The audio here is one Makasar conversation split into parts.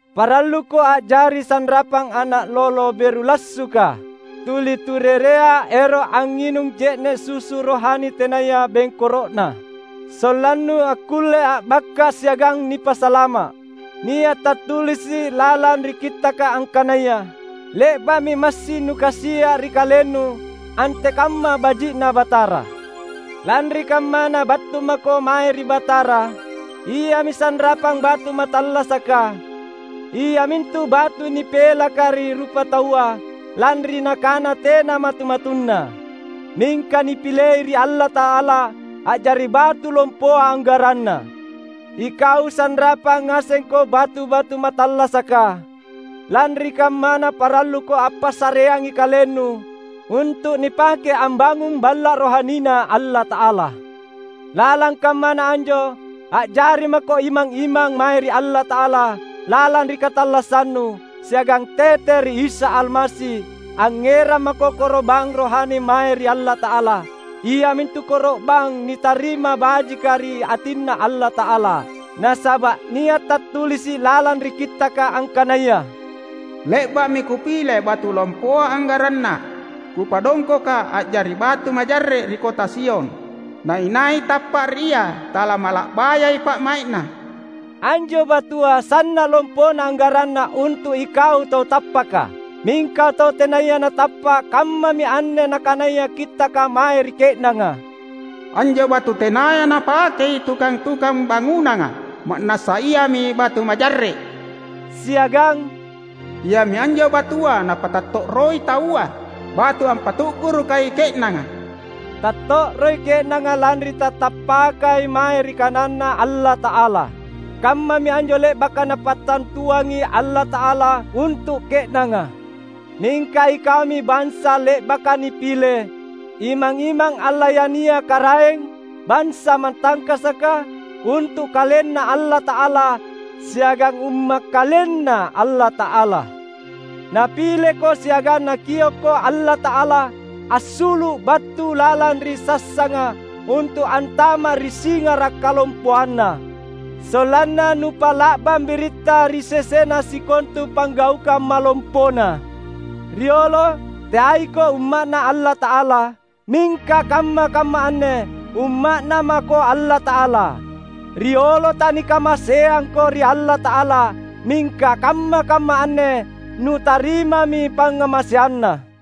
Paralluko a’jari sanrapang ana’ lolo beru lassuka, tuli turerea ero’ angnginung je’ne’ susu rohani tenaya bengkoro’na, sollannu akkulle a’bakka’ siagang nipasalama’. Nia’ tattulisi’ lalang ri Kittaka angkanaya, "Le’ba’mi massing nukasia’ ri kalennu, antekamma baji’na Batara." Lanri kammana, battu mako mae ri Batara. Iami sanrapang batu mattallasaka, iamintu batu nipelaka ri rupataua lanri nakana tena matu-matunna; mingka nipilei ri Allata’ala a’jari batu lompoa anggaranna. Ikau sanrapang ngasengko batu-batu mattallasaka. Lanri kammana paralluko ampassareangi kalennu untu’ nipake ambangung Balla’ rohaniNa Allata’ala. Lalang kammana anjo a’jari mako imang-imang mae ri Allata’ala lalang ri katallassannu; siagang tete ri Isa Almasi angngerang mako koro’bang rohani mae ri Allata’ala, iamintu koro’bang nitarima bajika ri atinNa Allata’ala. Nasaba’ nia’ tattulisi’ lalang ri Kittaka angkanaya, "Le’ba’mi Kupile batu lompoa anggaranna, Kupadongkoka a’jari batu majarre’ ri kota Sion; na inai tappa’ ri Ia talamala’bayai pa’mai’na." Anjo batua sanna’ lompona anggaranna untu’ ikau tau tappaka. Mingka tau tenaya natappa’, kammami anne nakanaya Kittaka mae ri ke’nanga, "Anjo batu tenaya napakei tukang-tukang bangunanga, ma’nassa iami batu majarre’." Siagang "Iami anjo batua napattatto’roi taua, batu ampatu’gurukai ke’nanga." Tatto’roi ke’nanga lanri tatappakai mae ri kananNa Allata’ala. Kammami anjo le’baka Napattantuangi Allata’ala untu’ ke’nanga. Mingka ikaumi bansa le’baka nipile, imang-imang allayania karaeng, bansa matangkasaka, untu’ KalenNa Allata’ala, siagang umma’ KalenNa Allata’ala. Napileko siagang Nakiokko Allata’ala assulu’ battu lalang ri sassanga untu’ antama’ ri singara’ kalompoanNa, sollanna nupa’la’bang biritta ri sesena sikontu panggaukang malompoNa. Riolo teaiko umma’Na Allata’ala, mingka kamma-kamma anne umma’Na mako Allata’ala. Riolo tanikamaseangako ri Allata’ala; mingka kamma-kamma anne nutarimami pangngamaseanNa.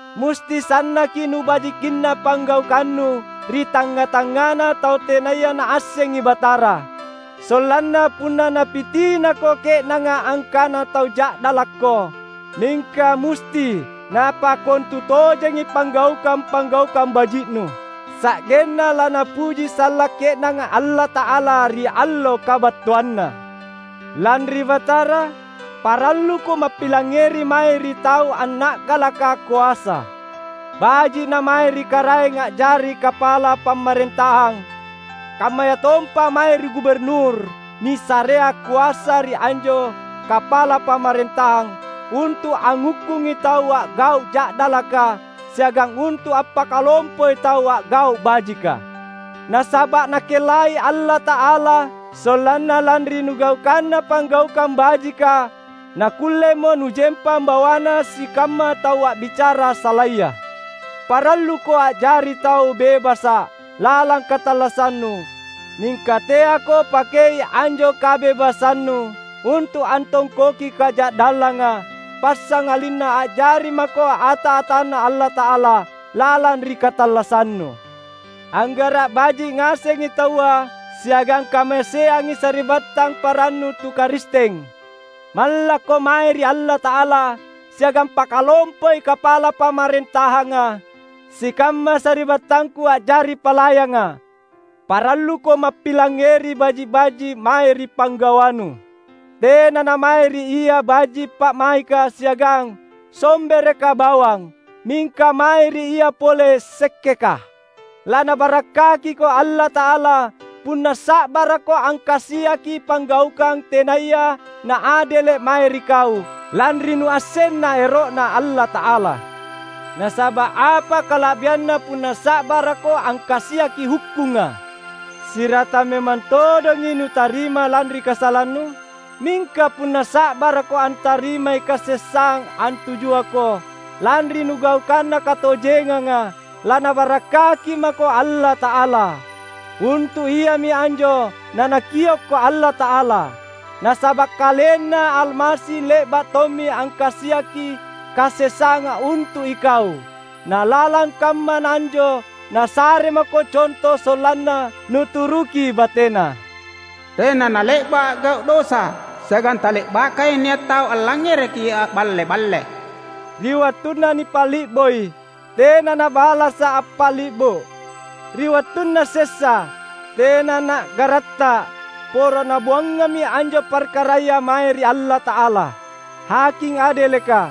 Musti sannaki nubajikinna panggaukannu ri tangnga-tangngana tau tenaya naassengi Batara. Sollanna punna napitinako ke’nanga angkana tau ja’dalakko, mingka musti napakkontutojengi panggaukang-panggaukang baji’nu; sa’genna lanapuji sallang ke’nanga Allata’ala, ri allo kabattuanNa. Lanri Batara, paralluko mappilangngeri mae ri tau anna’galaka koasa: baji’ namae ri karaeng a’jari Kapala pamarentahang, kammayatompa mae ri guburnur nisarea koasa ri anjo Kapala pamarentahang untu’ anghukkungi tau a’gau’ ja’dalaka siagang untu’ ampakalompoi tau a’gau’ bajika. Nasaba’ Nakellai Allata’ala sollanna lanri nugaukanna panggaukang bajika nakkullemo nujempang bawana sikamma tau a’bicara salaya. Paralluko a’jari tau bebasa’ lalang katallassannu; mingka teako pakei anjo kabebasannu untu’ antongkoki kaja’dallanga, passangalinna a’jari mako ata-atanNa Allata’ala lalang ri katallassannu. Anggara’ baji’ ngasengi taua, siagang kamaseangi sari’battang parannu tu Karisteng. Mallakko mae ri Allata’ala, siagang pakalompoi Kapala pamarentahanga. Sikamma sari’battangku a’jari palayanga, paralluko mappilangngeri baji’-baji’ mae ri pinggawanu; tena namae ri ia baji’ pa’maika siagang sombereka bawang, mingka mae ri ia pole sekkeka. LaNabarakkakiko Allata’ala, punna sa’barakko angkasiaki panggaukang tenaya naadele’ mae ri kau, lanri nuassenna ero’Na Allata’ala. Nasaba’ apa kala’bianna punna sa’barakko angkasiaki hukkungang siratang memang todonga nutarima lanri kasalannu? Mingka punna sa’barakko antarimai kasessang antujuako lanri nugaukanna katojenganga, laNabarakkaki mako Allata’ala. Untu’ iami anjo naNakiokko Allata’ala. Nasaba’ KalenNa Almasi le’ba’ tommi angkasiaki kasessanga untu’ ikau; na lalang kammana anjo Nasare mako conto sollanna nuturuki bateNa. Tena nale’ba’ a’gau’ dosa, siagang tale’bakai nia’ tau allangngereki a’balle-balle. Ri wattunna nipali’boi, tena Na’balasa’ appali’bo. Ri wattunna sessa, tena Na’garatta’; poro Nabuangammi anjo parkaraya mae ri Allata’ala, Haking adeleka,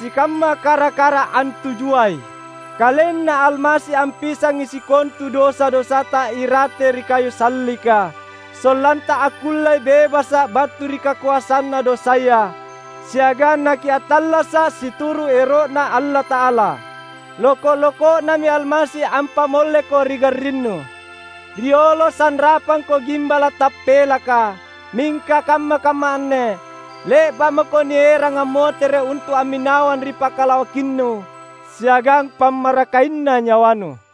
sikamma kara-kara antujuai. KalenNa Almasi ampisangi sikontu dosa-dosata irate ri kayu sallika, sollanta akkulle bebasa’ battu ri kakoasanna dosaya, siagang nakiattallasa’ situru’ ero’Na Allata’ala. Loko’-loko’Nami Almasi ampamolleko ri garrinnu. Riolo sanrapangko gimbala’ tappelaka, mingka kamma-kamma anne le’ba’ mako nierang ammotere’ untu’ amminawang ri Pakalawakinnu siagang Pammarakainna nyawanu.